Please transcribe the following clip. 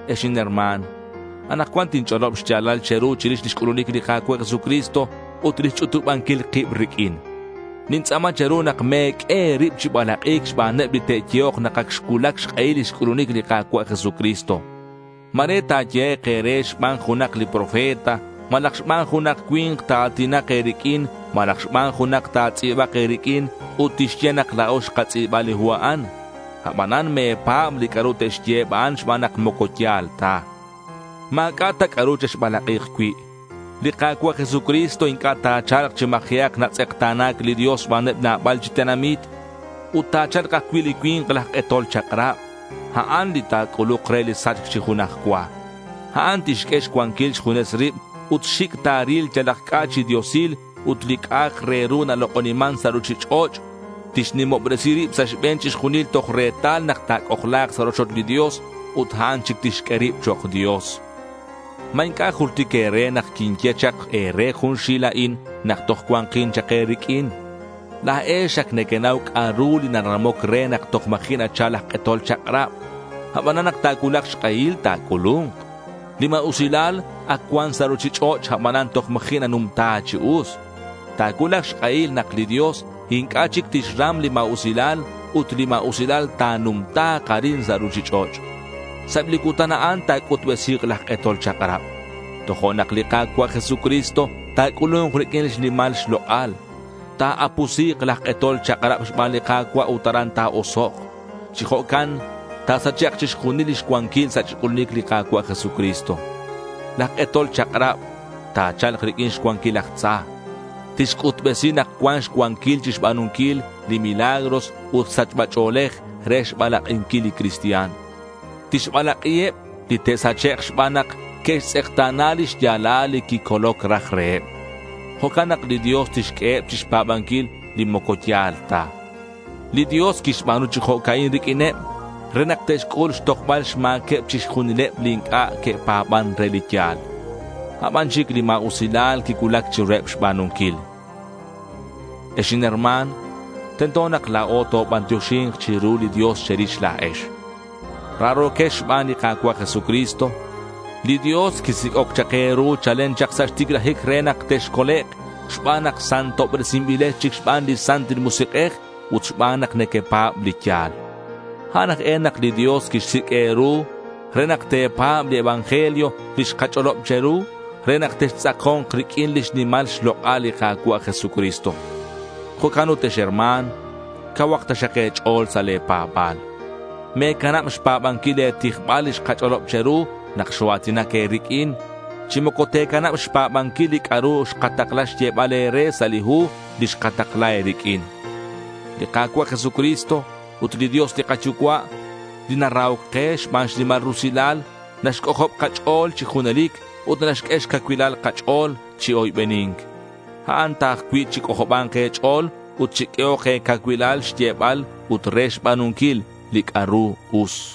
Ex inherma̱n, anakcuan tinch'olob xya̱lal che̱ru chirix lix c'ulunic li Ka̱cua' Jesucristo ut lix ch'utubanquil kib riq'uin. Nintz'a̱ma che̱ru nak me̱q'ue e̱rib chi balak'i̱c xbaneb li te'yehok nak ac xcuulac xk'ehil lix c'ulunic li Ka̱cua' Jesucristo. Ma̱re ta̱yehek' e̱re xban junak li profeta, malaj xban junak cui̱nk ta̱a̱tinak e̱riq'uin, malaj xban junak ta̱tz'i̱bak e̱riq'uin ut tixye nak la̱o xkatz'i̱ba li hu a'an. Abanan me̱pa̱b li c'a'ru te'xye eb a'an xban nak moco ya̱l ta. Ma̱c'a' ta c'a'ru chexbalak'i̱k cui'. Li Ka̱cua' Jesucristo inc'a' ta̱cha̱lk chi ma̱ji'ak natz'ekta̱na̱c li Dios xbaneb nabal chi tenamit. Ut ta̱cha̱lk ajcui' li cui̱nk laj k'etol chak'rab. A'an li ta̱c'uluk re li sachc chi junaj cua. A'an tixq'ue xcuanquil xjunes rib ut xic' ta̱ril yalak c'a' chi diosil ut li c'a'ak re ru nalok'oniman sa' ruchich'och'. Tixnimobresi rib sa' xbe̱n chixjunil toj retal nak ta̱c'ojla̱k sa' rochoch li Dios ut a'an chic tixq'ue rib chok' dios. ¿Ma inc'a' jultic e̱re nak quinye chak e̱re chixjunil a'in nak toj cuanquin chak e̱riq'uin? La̱ex ac nequenau c'a'ru li naramoc re nak toj ma̱ji' nachal laj k'etol chak'rab. Abanan nak ta̱cuulak xk'ehil, ta̱c'ulu̱nk. Li ma̱usilal ac cuan sa' ruchich'och', abanan toj ma̱ji' nanumta chi us. Ta̱cuulak xk'ehil nak li Dios inc'a' chic tixram li ma̱usilal ut li ma̱usilal ta̱numta̱k arin sa' ruchich'och'. Sa' eb li cutan a'an ta̱c'utbesi̱k laj k'etol chak'rab. Tojo'nak li Ka̱cua' Jesucristo ta̱c'ulu̱nk riq'uin xnimal xlok'al. Ta̱apusi̱k laj k'etol chak'rab xban li Ka̱cua' ut aran ta̱osok'. Chi jo'can ta̱sachek' chixjunil lix cuanquil sa' xc'ulunic li Ka̱cua' Jesucristo. Laj k'etol chak'rab ta̱cha̱lk riq'uin xcuanquil laj tza. Tixc'utbesi nak cuan xcuanquil chixba̱nunquil li milagros ut sachba ch'o̱lej re xbalak'inquil li cristian. Tixbalak'iheb li te'sachek' xban nak que'xtz'ekta̱na li xya̱lal li quicoloc raj reheb. Jo'can nak li Dios tixq'ueheb chixpa̱banquil li moco ya̱l ta. Li Dios quixba̱nu chi jo'ca'in riq'uineb re nak te'xc'ul xtojbal xma̱queb chixjunileb li inc'a' que'pa̱ban re li ya̱l. A' ban chic li ma̱usilal quicuulac chiruheb xba̱nunquil. Ex inherma̱n, tento nak la̱o tobantioxi̱nk chiru li Dios che̱rix la̱ex. Raro̱quex xban li Ka̱cua' Jesucristo. Li Dios quisic'oc chak e̱ru chalen chak sa' xticlajic re nak texcolek' xban nak santobresinbilex chic xban li Santil Musik'ej ut xban nak nequepa̱b li ya̱l. A'an aj e nak li Dios quixsic' e̱ru re nak te̱pa̱b li evangelio li xkach'olob che̱ru re nak textz'ako̱nk riq'uin lix nimal xlok'al li Ka̱cua' Jesucristo. Jo'can ut ex herma̱n, cauhak taxak e̱ch'o̱l sa' le̱ pa̱ba̱l. Me̱canab xpa̱banquil le̱ tijbal li xkach'olob che̱ru nak xoa̱tinac e̱riq'uin. Chi moco te̱canab xpa̱banquil li c'a'ru xkatakla xyebal e̱re sa' li hu li xkatakla e̱riq'uin. Li Ka̱cua' Jesucristo ut li Dios li kaYucua', li narahoc ke, xban xnimal rusilal naxc'ojob kach'o̱l chi junelic ut naxq'ue xcacuilal kach'o̱l chi oybeni̱nc. A'an ta ajcui' chic'ojoba̱nk e̱ch'o̱l ut chiq'uehok e̱cacuilal re xyebal ut re xba̱nunquil li c'a'ru us.